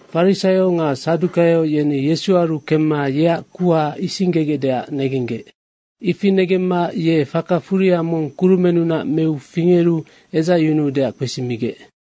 Farisaio nga sadukaio yeni Yesuaru kemma yeac kuha isinggegecdeac negenggec. Ifi negemma ye faka furia mong kurumennunac meu fingeru edzacyunuudeac kpesimigec.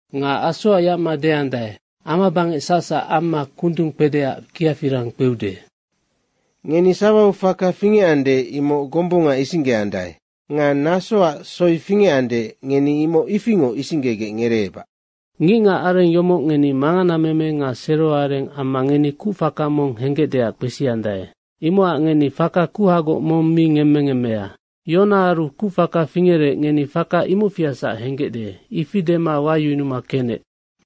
Nga asoac yacma deandae, ‘Amabangec sacsac amma kundung kpedeac kiafirang kpeude.’ Ngeni sawau faka fingecande, imoc gombunganoc isinggeandae nga nasoac soi fingecande ngeni imoc ifingoc isinggegec ngereebac. Ngicngac areng yomoc ngeni manganameme nga seroareng amma ngeni kucfaka mong henggecdeac kpesiandae. Imocac ngeni faka kuhagoc mong mi ngemmengemmea. Yonaaru kucfaka fingerec, ngeni faka imocfiasac henggecde.” Ifi dema wayunuma kenec.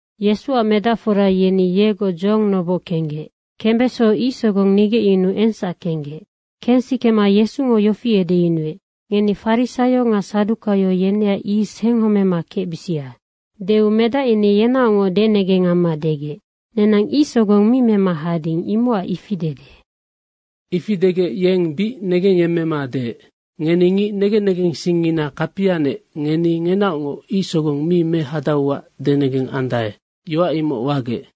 Yesuac medacfora yeni yegoc dzohong noboc kenggec. Kembeso ic sogong nigecyunuu engsac kenggec. Kensikema Yesungo yofi edeyunuec, “Ngeni farisaio nga sadukaio yeneac yis henghomema kecbisia.” Deu medac yeni yenaocngoc denegeng amma degec, “Nenang ic sogong mi mema hading, imocacnoc ifi dede.” Ifi degec yeng bic negengyemmema deec, “Ngeni ngic negen negensingngina kapianec, ngeni ngenaocngoc ic sogong mi mehadauac denegeng andae, yoac imoc wagec.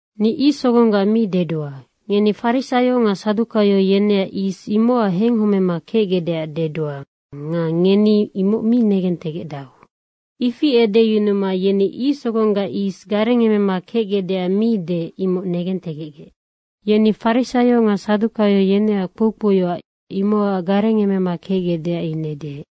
Ni ic sogonggac mi dedua. Ngeni farisaio nga sadukaio yeneac yis, imocac henghomema kecgecdeac dedua nga ngeni imoc mi negentegecdau.” Ifi edeyunuma yeni ic sogonggac yis garengeme kecgecdeac mi deec, imoc negentegecgec. Yeni farisaio nga sadukaio yeneac kpoukpouyoac, imocac garengemema kecgecdeac ine deec.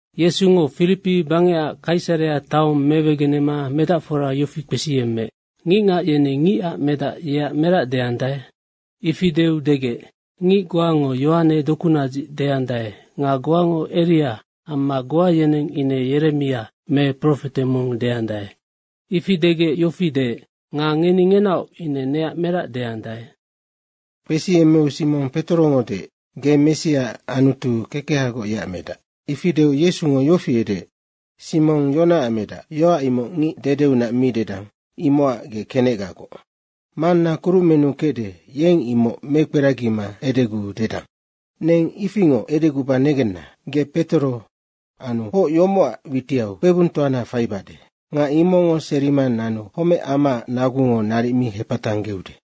Yesungo Firipi bangecac Kaisarea taong mewegenema medacfora yofi kpesiyemmeec, “Ngicngac yeni Ngicac Medac yeac merac deandae?” Ifi deu degec, “Ngic goango Yohane dokunadzic deandae nga goango Eria amma goa yeneng ine Yeremia me profete mong deandae.” Ifi degec yofi deec, “Nga ngeni ngenaoc ine neac merac deandae?” Kpesiyemmeu Simong Petorongo deec, “Ge Messia, Anutu kekehagoc yeac Medac.” Ifi deu Yesungo yofi edeec, “Simong, Yonaac medac, yoac imoc ngic dedeunac mi dedang, imocac ge kenecgagoc. Manna kurumennu kecde, yennoc imoc mekperagima edeguu dedang. Neng ifingoc edeguba negenna, ge Petoro, anu hoc yomocac witiau kpebungtoana faibade. Nga imocngo serima nanu homec amaac nagungo naric mi hepatanggeude.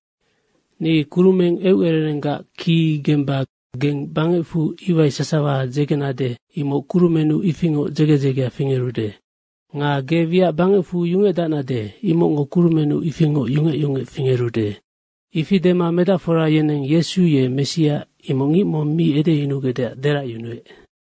Ni kurumeng eucererenggac ki gemba geng bangecfu iwai sasawa dzegenade, imoc kurumennu ifingoc dzege dzegea fingerude. Nga ge wiac bangecfu yungecdacnade, imocngo kurumennu ifingoc yungec yungec fingerude.” Ifi dema medacfora yeneng Yesu ye Messia, imoc ngic mong mi edeyunugecdeac deracyunuec.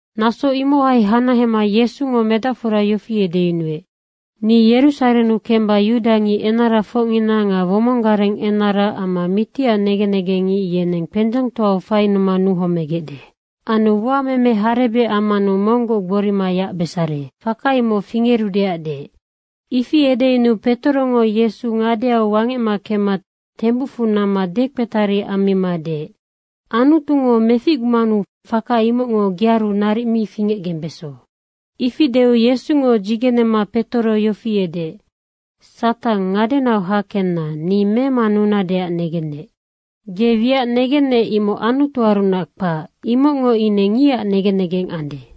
Naso imohai hanahema Yesungo medacfora yofi edeyunuec, “Ni Yerusarennu kemba yudangic enarafocngina nga womong gareng enara amma mitiac negen negengngic yeneng kpendzengtoau fainuma nuhomegecde. Anu uameme harebec ammanu monggoc gborima yacbesare.” Faka imoc fingerudeac deec. Ifi edeyunuu Petorongo Yesu ngadeau wangec kemma tembucfu namma dekpetari ammima deec, “Anutungo meficgumanu faka imocngo gearu naric mi fingecgembeso.” Ifi deu Yesungo dzigenema Petoro yofi edeec, “Satang, ngadenau hakenna, ni memanunadeac negennec. Ge wiac negennec, imoc Anutuarunac kpac, imocngo ine ngicac negen negeng ande.”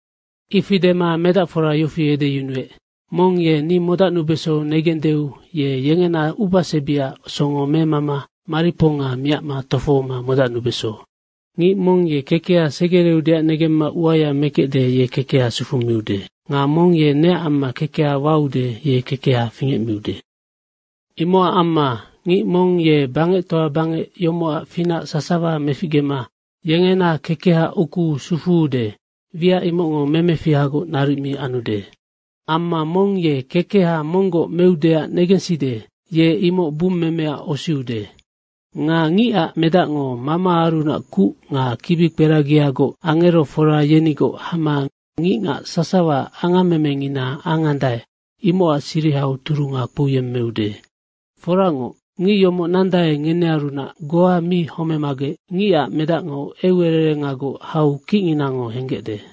Ifi dema medacfora yofi edeyunuec, “Mong ye ni modacnubeso negendeu ye yengena ubasebiaac songo memama mariponga miacma tofohoma modacnubeso. Ngic mong ye kekeha segereudeac negemma uaya mekecde, ye kekeha sufumiude. Nga mong ye neac amma kekeha waude, ye kekeha fingecmiude. Imocac amma ngic mong ye bangectoa bangec yomocac finac sasawa meficgema yengena kekeha ukuu sufuude, wiac imocngo memefihagoc naric mi anude. Amma mong ye kekeha monggoc meudeac negenside, ye imoc bummemeac osiude. Nga Ngicac Medacngo Mamaarunac kuc nga kibikperagiagoc angerofora yenigoc hama ngicngac sasawa angammemengina angandae, imocac sirihau turunga kpouyemmeude. Foracngoc, ngic yomoc nandae, ngenearunac goa mi homemagec Ngicac Medacngo eucererengagoc hau kicnginango henggecde.”